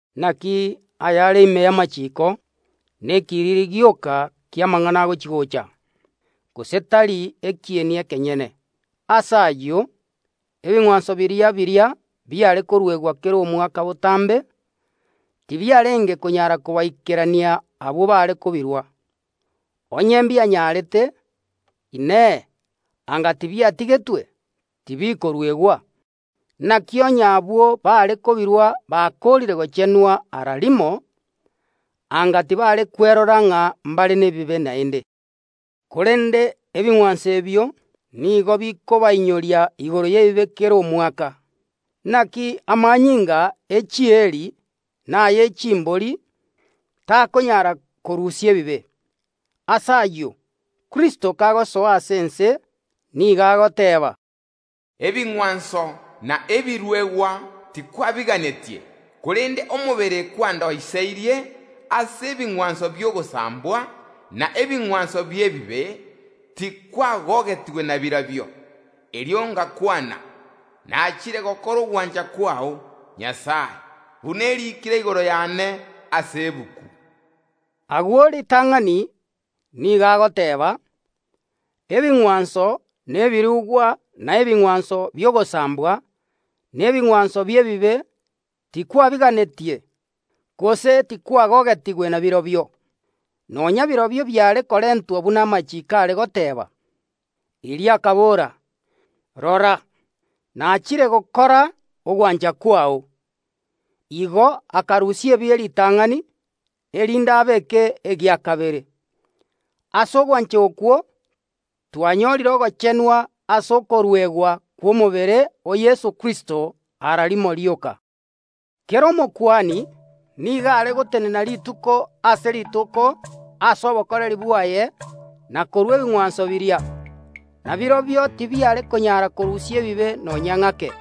Naki ayare ime y’amachiiko nekiriri gioka ki’amang’ana agochi‐gocha, gose tari ekieni ekenyene. Ase ayio, ebing’wanso biria biria biare koruegwa kera omwaka botambe tibiarenge konyara kobaikerania abwo baare kobirua. Onye mbianyarete, Inee, anga tibiatigetwe, tibikoruegwa? Naki onye abwo baare kobirua bakoorire gochenwa ara rimo, anga tibare kwerora ng’a mbare nebibe naende. Korende ebing’wanso ebio nigo bikobainyoria igoro y’ebibe kera omwaka. Naki amanyinga e chieeri na aye chimbori takonyara korusia ebibe. Ase ayio, Kristo kagosoa ase ense nigo agoteeba, “Ebing’wanso na ebiruegwa tikwabiganetie, korende omobere kwandoiseirie. Ase ebing’wanso bi’ogosambwa, na ebing’wanso bi’ebibe, tikwagogetigwe nabirobio. Erio ngakwana: Nachire gokora ogwancha kwao, Nyasae, buna eriikire igoro yane ase egetabu.” Agwo ritang’ani nigo agoteeba, “Ebing’wanso, na ebirugwa, na ebing’wanso bi’ogosambwa, na ebing’wanso bi’ebibe tikwabiganetie, gose tikwagogetigwe nabirobio”, nonya birobio biare korentwa buna amachiiko are goteeba. Erio akabora, “Rora, nachire gokora ogwancha kwao.” Igo akarusia ebie ritang’ani, erinde abeeke egia kabere. Ase ogwancha okwo twanyorire ogochenwa ase okoruegwa kw’omobere o Yeso Kristo ara rimo rioka. Kera Omokuani nigo are gotenena rituko ase rituko ase obokoreri bwaye na korua ebing’wanso biria, na birobio tibiare konyara korusia ebibe nonya ng’ake.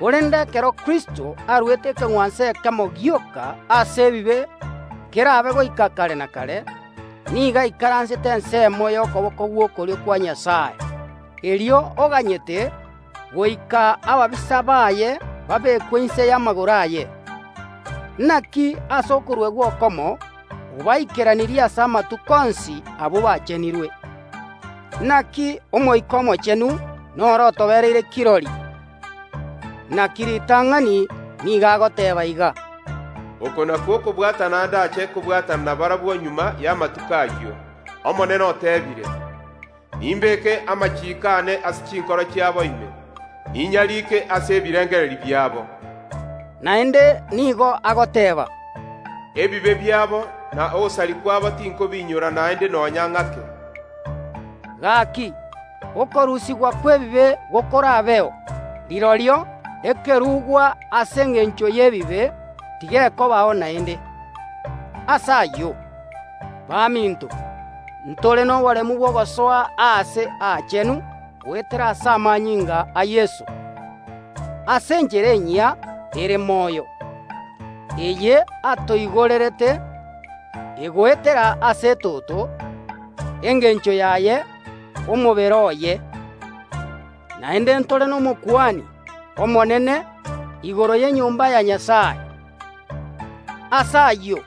Korende ekero Kristo aruete ekeng’wanso ekemo gioka ase ebibe kerabe goika kare na kare, nigo aikaransete ensemo y’okoboko gw’okorio kwa Nyasae. Erio oganyete goika ababisa baye babekwe inse y’amagoro aye. Naki ase okoruegwa okomo obaikeranirie ase amatuko onsi abwo bachenirwe. Naki Omoika Omochenu noro otobereire kirori. Naki ritang’ani nigo agoteeba iga: “Oko nakwo okobwatana ndache kobwatana nabarabwo magega y’amatuko ayio, Omonene oteebire: Nimbeke amachiiko aane ase chinkoro chiabo ime, ninyarike ase ebirengererio biabo.” Naende nigo agoteeba, “Ebibe biabo, na ogosaria kwabo tinkobiinyora naende nonya ng’ake.” Gaki, okorusigwa kw’ebibe gokorabeo, rirorio ekerugwa ase engencho y’ebibe tigekobao naende. Ase ayio, baminto, ntore noboremu bw’ogosoa Aase Aachenu goetera ase amanyinga a Yeso, ase enchera enyia ere moyo, eye atoigorerete, egoetera ase etoto, engencho yaye omobere oye. Naende ntore n’Omokuani Omonene igoro y’enyomba ya Nyasae. Ase ayio,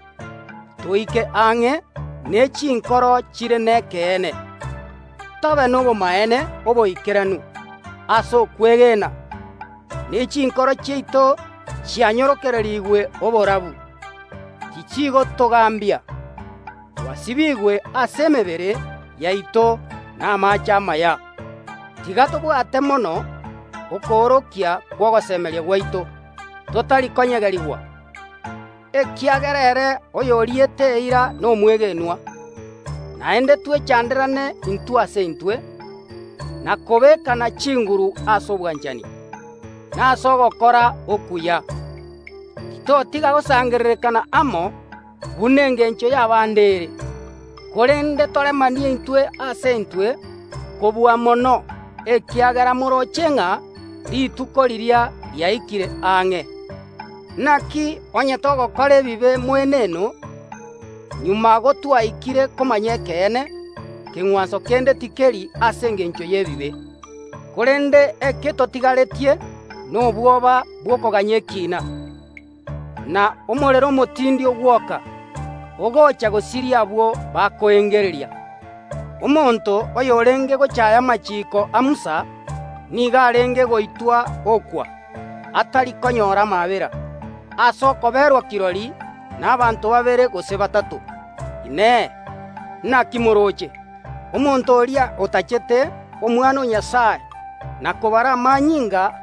toike ang’e ne chinkoro chire nekeene, tobe nobomaene oboikeranu ase okwegena, ne chinkoro chiaito chianyororokerigwe oborabu, tichigotogambia, twasibiigwe ase emebere yaito namaache amaya. Tiga tobwate mono okoorokia kw’ogosemeria gwaito, totari konyegerigwa; ekiagera ere oyoriete eira nomwegenwa. Naende twechanderane intwe ase intwe, na kobeekana chinguru ase obwanchani, na ase ogokora okuya. Titotiga gosangererekana amo, buna engencho y’abande ere, korende toremanie intwe ase intwe, kobua mono ekiagera morooche ng’a Rituko riria riaikire ang’e. Naki onye togokora ebibe moeneno magega gotwaikire komanya ekeene, keng’wanso kende tikeri ase engencho y’ebibe. Korende eke totigaretie nobwoba bw’okoganya ekiina, na omorero omotindi ogwoka, ogocha gosiria abwo bakoengereria. Omonto oyorenge gochaaya amachiiko a Musa nigo arenge goitwa okwa, atari konyora amaabera, ase okoberwa kirori nabaanto babere gose batato. Inee! Naki morooche? Omonto oria otanchete Omwana o Nyasae, na kobara amanyinga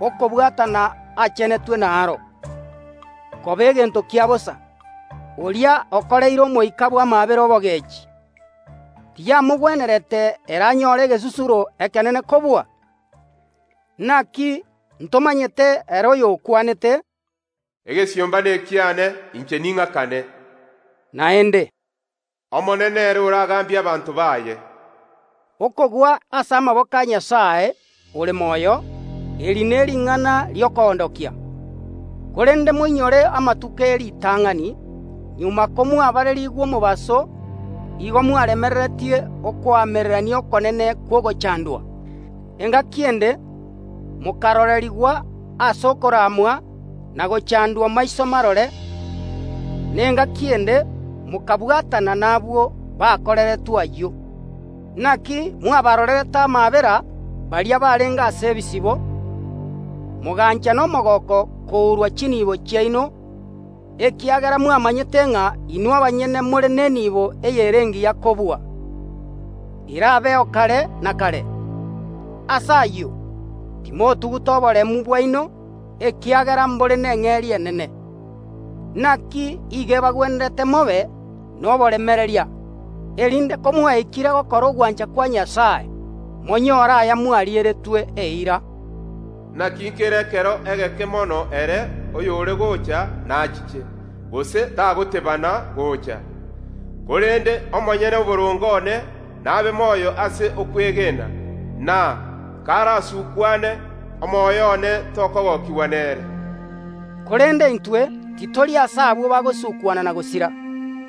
y’okobwatana, achenetwe naro, koba egento kia bosa, oria okoreire Omoika bw’amaabera obogeechi, tiyamogwenerete ere anyore egesusuro ekenene kobua? Naki ntomanyete ere oyokwanete, “Egesiomba nekiane, inche ning’akane,” naende, “Omonene nere oragambie abanto baye.” Okogwa ase amaboko a Nyasae ore moyo, eri nering’ana ri’okoondokia. Korende moinyore amatuko e ritang’ani, magega komwabarerigwe omobaso igo mwaremereretie okoamererania okonene kw’ogochandwa. Engaki ende mokarorerigwa ase okoramwa na ogochandwa maiso marore, na engaki ende mokabwatana nabwo bakoreretwe ayio. Naki mwabarorerete amaabera baria barenge ase ebisibo, mogancha nomogooko kourwa chinibo chiaino, ekiagera mwamanyete ng’a inwe abanyene more nenibo eyere engiya kobua, erabeo kare na kare. Ase ayio, timotuguta oboremu bwaino, ekiagera mbore neng’eria enene. Naki iigo ebagwenerete mobe noboremereria, erinde komwaikire gokora ogwancha kwa Nyasae monyore aya mwarieretwe eira. “Naki nkere ekero egeke mono, ere oyore gocha nachiche, gose tagotebana gocha, korende omonyene oboronge one nabe moyo ase okwegena, na, karasukwane, omoyo one tokogokigwa nere.” Korende intwe titori ase abwo bagosukwana na gosira,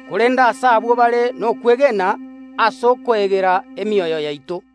korende ase abwo bare nokwegena ase okoegera emioyo yaito.